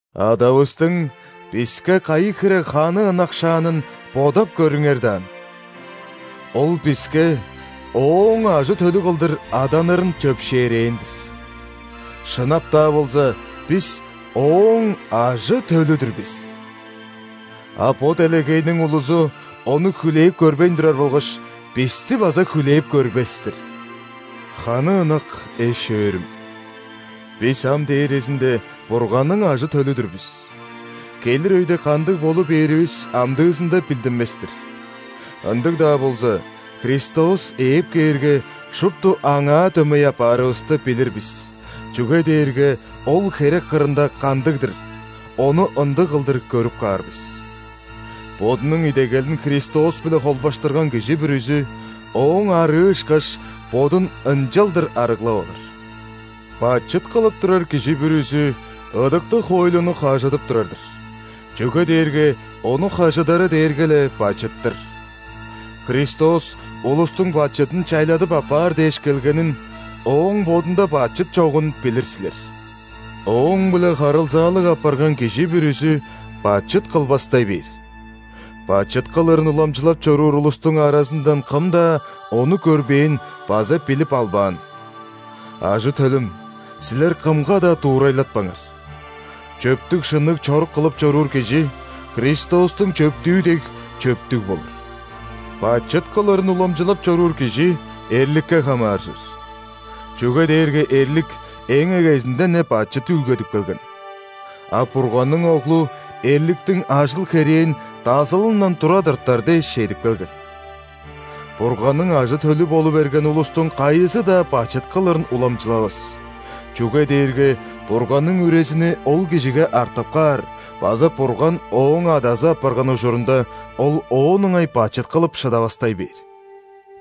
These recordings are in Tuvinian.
Адавыстың биске кайы хире ханы ынакшаанын бодап көрүңер даан. Ол биске Ооң ажы-төлү кылдыр аданырын чөпшээрээн-дир! Шынап-даа болза, бис Ооң ажы-төлү-дүр бис! А бо делегейниң улузу Ону хүлээп көрбейн турар болгаш, бисти база хүлээп көрбес-тир. Ханы ынак эш-өөрүм! Бис ам дээрезинде Бурганның ажы-төлү-дүр бис, келир өйде кандыг болу бээривис амдыызында билдинмес-тир. Ындыг-даа болза, Христос ээп кээрге, шупту Аңаа дөмей апаарывысты билир бис, чүге дээрге Ол херек кырында кандыг-дыр, Ону ындыг кылдыр көрүп каар бис. Бодунуң идегелин Христос-биле холбаштырган кижи бүрүзү, Ооң арыы ышкаш, бодун ынчалдыр арыглап алыр. Бачыт кылып турар кижи бүрүзү ыдыктыг хоойлуну хажыдып турар-дыр, чүге дээрге ону хажыдары дээрге-ле бачыт-тыр. Христос улустуң бачыдын чайладып аппаар дээш келгенин, Ооң Бодунда бачыт чогун билир силер. Ооң-биле харылзаалыг апарган кижи бүрүзү бачыт кылбастай бээр. Бачыт кылырын уламчылап чоруур улустуң аразындан кым-даа Ону көрбээн база билип албаан. Ажы-төлүм, силер кымга-даа дуурайлатпаңар. Чөптүг-шынныг чорук кылып чоруур кижи, Христостуң чөптүү дег, чөптүг болур. Бачыт кылырын уламчылап чоруур кижи эрликке хамааржыр, чүге дээрге эрлик эң эгезинден-не бачыт үүлгедип келген. А Бурганның Оглу эрликтиң ажыл-херээн дазылындан тура тыртар дээш чедип келген. Бурганның ажы-төлү болу берген улустуң кайызы-даа бачыт кылырын уламчылавас, чүге дээрге Бурганның Үрезини ол кижиге артып каар база Бурган ооң Адазы апарган ужурунда, ол оон ыңай бачыт кылып шыдавастай бээр.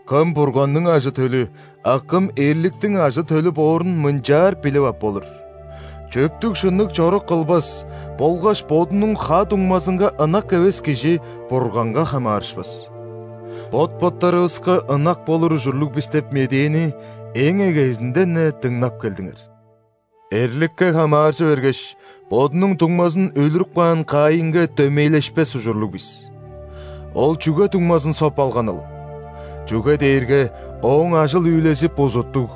Кым – Бурганның ажы-төлү, а кым – эрликтиң ажы-төлү боорун мынчаар билип ап болур: чөптүг-шынныг чорук кылбас болгаш бодунуң ха-дуңмазынга ынак эвес кижи Бурганга хамаарышпас. Бот-боттарывыска ынак болур ужурлуг бис деп медээни эң эгезинден-не дыңнап келдиңер. Эрликке хамааржы бергеш, бодунуң дуңмазын өлүрүп каан Каинге дөмейлешпес ужурлуг бис. Ол чүге дуңмазын соп алганыл? Чүге дээрге ооң ажыл-үүлези бузуттуг,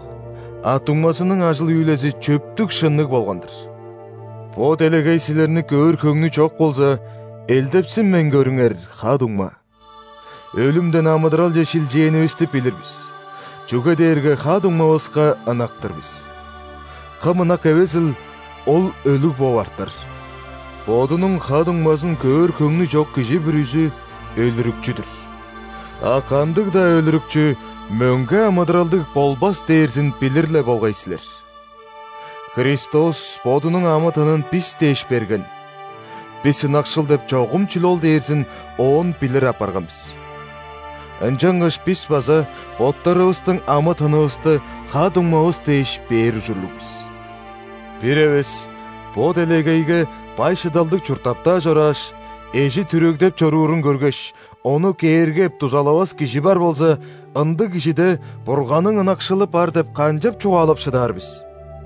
а дуңмазының ажыл-үүлези чөптүг-шынныг болган-дыр. Бо делегей силерни көөр хөңнү чок болза, элдепсинмейн көрүңер, ха-дуңма. Өлүмден амыдыралче шилчээнивисти билир бис, чүге дээрге ха-дуңмавыска ынак-тыр бис. Кым ынак эвезил, ол өлүг бооп артар. Бодунуң ха-дуңмазын көөр хөңнү чок кижи бүрүзү – өлүрүкчү-дүр, а кандыг-даа өлүрүкчү мөңге амыдыралдыг болбас дээрзин билир-ле болгай силер. Христос Бодунуң амы-тынын бис дээш берген, бис ынакшыл деп чогум чүл ол дээрзин оон билир апарган бис. Ынчангаш бис база боттарывыстың амы-тынывысты ха-дуңмавыс дээш бээр ужурлуг бис. Бир эвес бо делегейге бай-шыдалдыг чурттап-даа чорааш, эжи түрегдеп чоруурун көргеш, ону кээргеп, дузалавас кижи бар болза, ындыг кижиде Бурганның ынакшылы бар деп канчап чугаалап шыдаар бис?!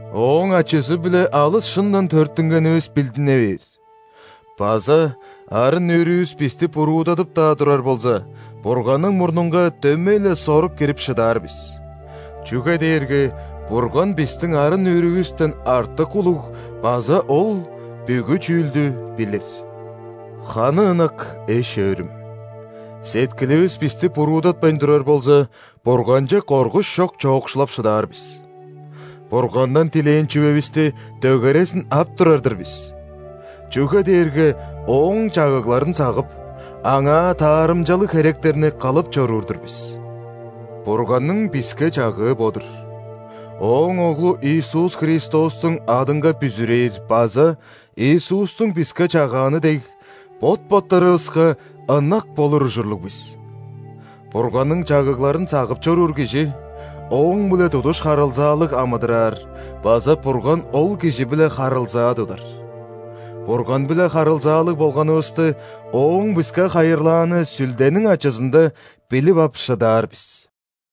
Ооң ачызы-биле алыс шындан төрүттүнгенивис билдине бээр база арын-нүүрүвүс бисти буруудадып-даа турар болза, Бурганның мурнунга дөмей-ле сорук кирип шыдаар бис, чүге дээрге Бурган бистиң арын-нүүрүвүстен артык улуг база Ол бүгү чүүлдү билир. Ханы ынак эш-өөрүм, сеткиливис бисти буруудатпайн турар болза, Бурганче коргуш чок чоокшулап шыдаар бис. Бургандан дилээн чүвевисти дөгерезин ап турар-дыр бис, чүге дээрге Ооң чагыгларын сагып, Аңаа таарымчалыг херектерни кылып чоруур-дур бис. Бурганның биске чагыы бо-дур: Ооң Оглу Иисус Христостуң адынга бүзүрээр база, Иисустуң биске чагааны дег, бот-боттарывыска ынак болур ужурлуг бис. Бурганның чагыгларын сагып чоруур кижи Ооң-биле тудуш харылзаалыг амыдыраар база Бурган ол кижи-биле харылзаа тудар. Бурган-биле харылзаалыг болганывысты Ооң биске хайырлааны Сүлдениң ачызында билип ап шыдаар бис.